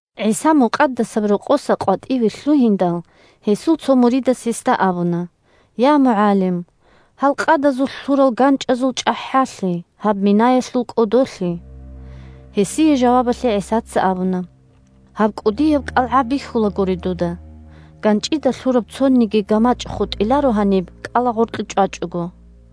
ГӀиса Мукъадасаб Рокъоса къватӀиве лъугьиндал, гьесул цо муридас гьесда абуна: – Я МугӀалим! Гьал къадазулъ лъурал ганчӀазул чӀахӀалъи, гьаб минаялъул кӀодолъи! Гьесие жавабалъе ГӀисаца абуна: – Гьаб кӀудияб кӀалгӀа бихьулагури дуда? ГанчӀида лъураб цониги гамачӀ хутӀиларо гьаниб кӀалагъоркье чӀвачӀого.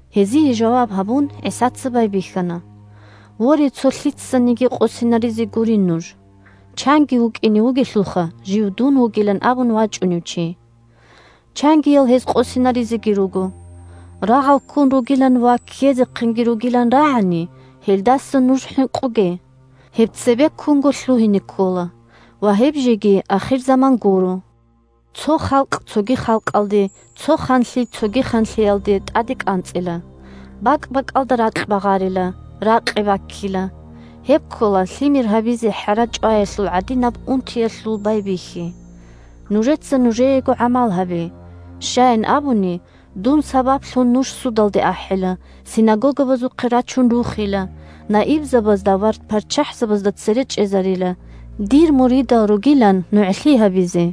Гьезие жаваб гьабун, ГӀисаца байбихьана: – Воре, цо лъицаниги къосинаризе гурин нуж! Чанги вукӀине вугелъулха, жив дун вугилан абун вачӀунев чи. Чангиял гьез къосинаризеги руго. Рагъал ккун ругилан ва ккезехъинги ругилан рагӀани, гьелдаса нуж хӀинкъуге. Гьеб цебеккунго лъугьине ккола, ва гьеб жеги ахирзаман гуро. Цо халкъ цоги халкъалде, цо ханлъи цоги ханлъиялде тӀаде кӀанцӀила. БакӀ-бакӀалда ракь багъарила, ракъи баккила. Гьеб ккола лъимер гьабизе хӀара чӀваялъул гӀадинаб унтиялъул байбихьи. Нужеца нужеего гӀамал гьабе: щаян абуни, дун сабаблъун нуж судалде ахӀила, синагогабазухъе рачун рухила, наибзабазда ва парччахӀзабазда цере чӀезарила, дир муридал ругилан нугӀлъи гьабизе.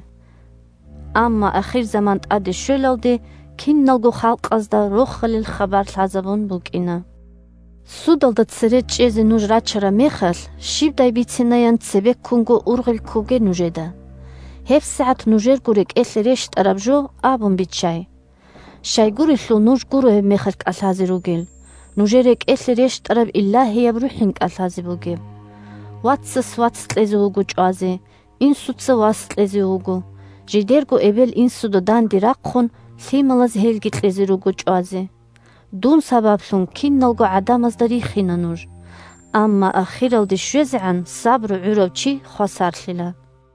Амма ахирзаман тӀаде щвелалде киналго халкъазда Рохалил хабар лъазабун букӀина. Судалда цере чӀезе нуж рачараб мехалъ, щибдай бицинаян цебеккунго ургъел ккоге нужеда. ГьебсагӀат нужерго рекӀелъе рещтӀараб жо абун биччай. Щайгурелъул нуж гуро гьебмехалъ кӀалъазе ругел, нужер рекӀелъе рещтӀараб Илагьияб РухӀин кӀалъазе бугеб. Вацас вац кьезе вуго чӀвазе, инсуца вас кьезе вуго. Жидерго эбел-инсуда данде рахъун, лъималаз гьелги кьезе руго чӀвазе. Дун сабаблъун киналго гӀадамазда рихина нуж. Амма ахиралде щвезегӀан сабру гӀурав чи хвасарлъила.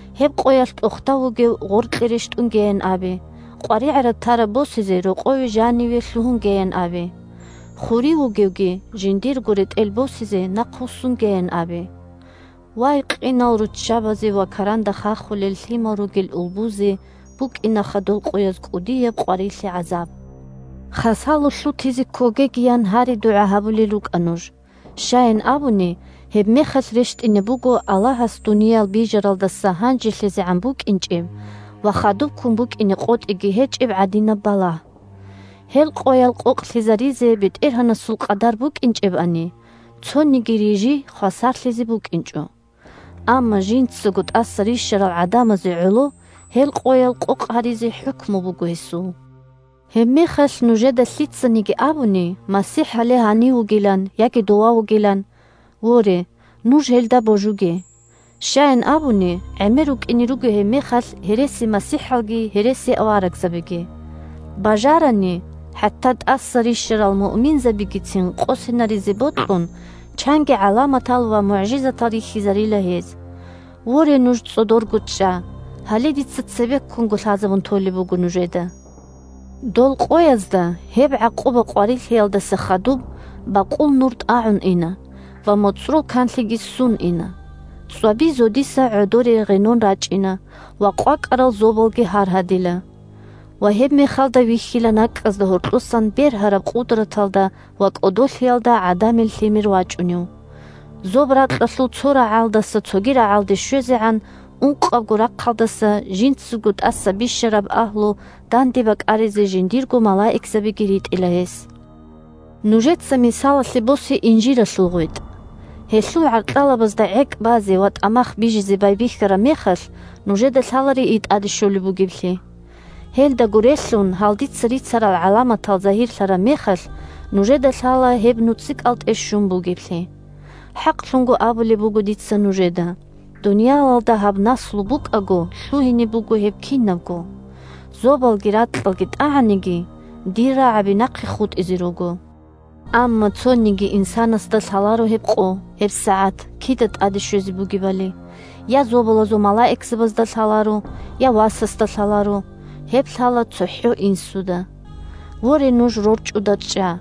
Гьеб къоялъ тӀохда вугев гъоркье рещтӀунгеян абе, къваригӀараб-тараб босизе рокъове жаниве лъугьунгеян абе. Хурив вугевги жиндирго ретӀел босизе нахъвуссунгеян абе. Вай, къинал руччабазе ва каранда хахулел лъимал ругел улбузе букӀинаха дол къояз кӀудияб къварилъи-гӀазаб! Хасало лъутизе ккогегиян гьари-дугӀа гьабулел рукӀа нуж. Щаян абуни, гьебмехалъ рещтӀине буго Аллагьас дуниял бижаралдаса гьанжелъагӀан букӀинчӀеб ва хадубккун букӀине къотӀиги гьечӀеб гӀадинаб балагь. Гьел къоял къокълъизаризе БетӀергьанасул къадар букӀинчӀебани, цониги рижи хвасарлъизе букӀинчӀо. Амма жинцаго тӀаса рищарал гӀадамазе гӀоло гьел къоял къокъ гьаризе хӀукму буго гьесул. Гьебмехалъ нужеда лъицаниги абуни МасихӀ гьале гьанив вугилан, яги дова вугилан, – воре, нуж гьелда божуге. Щаян абуни, гӀемер рукӀине руго гьебмехалъ гьересимасихӀалги гьересиаварагзабиги. Бажарани, хӀатта тӀаса рищарал муъминзабигицин къосинаризе бокьун, чанги гӀаламатал ва мугӀжизатал рихьизарила гьез. Воре, нуж цӀодорго чӀа; гьале дица цебеккунго лъазабун толеб буго нужеда! Дол къоязда, гьеб гӀакъуба-къварилъиялдаса хадуб, бакъул нур тӀагӀун ина, ва моцӀрол канлъиги ссун ина. ЦӀваби зодиса гӀодоре гъенон рачӀина, ва къвакӀарал зобалги гьаргьадила. Ва гьебмехалда вихьила накӀкӀазда гьоркьосан бергьараб къудраталда ва кӀодолъиялда ГӀадамил Лъимер вачӀунев. Зоб-ракьалъул цо рагӀалдаса цоги рагӀалде щвезегӀан ункъабго рахъалдаса жинцаго тӀаса бищараб агьлу данде бакӀаризе жиндирго малаикзабиги ритӀила гьес. Нужеца мисалалъе босе инжиралъул гъветӀ. Гьелъул гӀаркьалабазда гӀекӀ базе ва тӀамах бижизе байбихьараб мехалъ нужеда лъала рии тӀаде щолеб бугеблъи. Гьелдаго релълъун, гьал дица рицарал гӀаламатал загьирлъараб мехалъ, нужеда лъала гьеб нуцӀикӀалтӀе щун бугеблъи. ХӀакълъун абулеб буго дица нужеда: дуниялалда гьаб наслу букӀаго лъугьине буго гьеб кинабго. Зобалги ракьалги тӀагӀаниги, дир рагӀаби нахъе хутӀизе руго. Амма цониги инсанасда лъаларо гьеб къо, гьеб сагӀат кида тӀаде щвезе бугебали. Я зобалазул малаикзабазда лъаларо, я Васасда лъаларо, гьеб лъала цохӀо Инсуда. «Воре, нуж рорчӀуда чӀа!»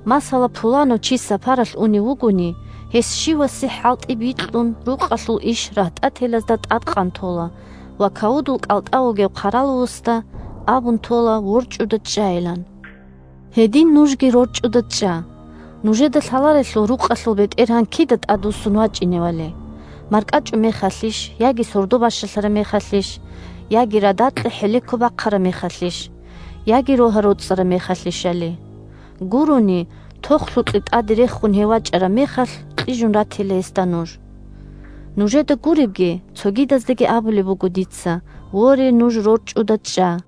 Масала, пуланав чи сапаралъ унев вугони, гьес щивасе хӀалтӀи бикьун рукъалъул иш рагьтӀателазда тӀадкъан тола ва кавудул кӀалтӀа вугев хъаравуласдаги абун тола ворчӀуда чӀайилан. Гьедин нужги рорчӀуда чӀа! Нужеда лъаларелъул рукъалъул бетӀергьан кида тӀадвуссун вачӀиневали: маркӀачӀумехалъищ, яги сордо бащалъараб мехалъищ, яги радакье хӀелеко бахъараб мехалъищ, яги рогьа-роцӀараб мехалъищали. Гурони, тохлъукье тӀаде рехун гьев вачӀараб мехалъ, кьижун ратила гьесда нуж! Нужеда гуребги, цогидаздаги абулеб буго дица: воре, нуж рорчӀуда чӀа!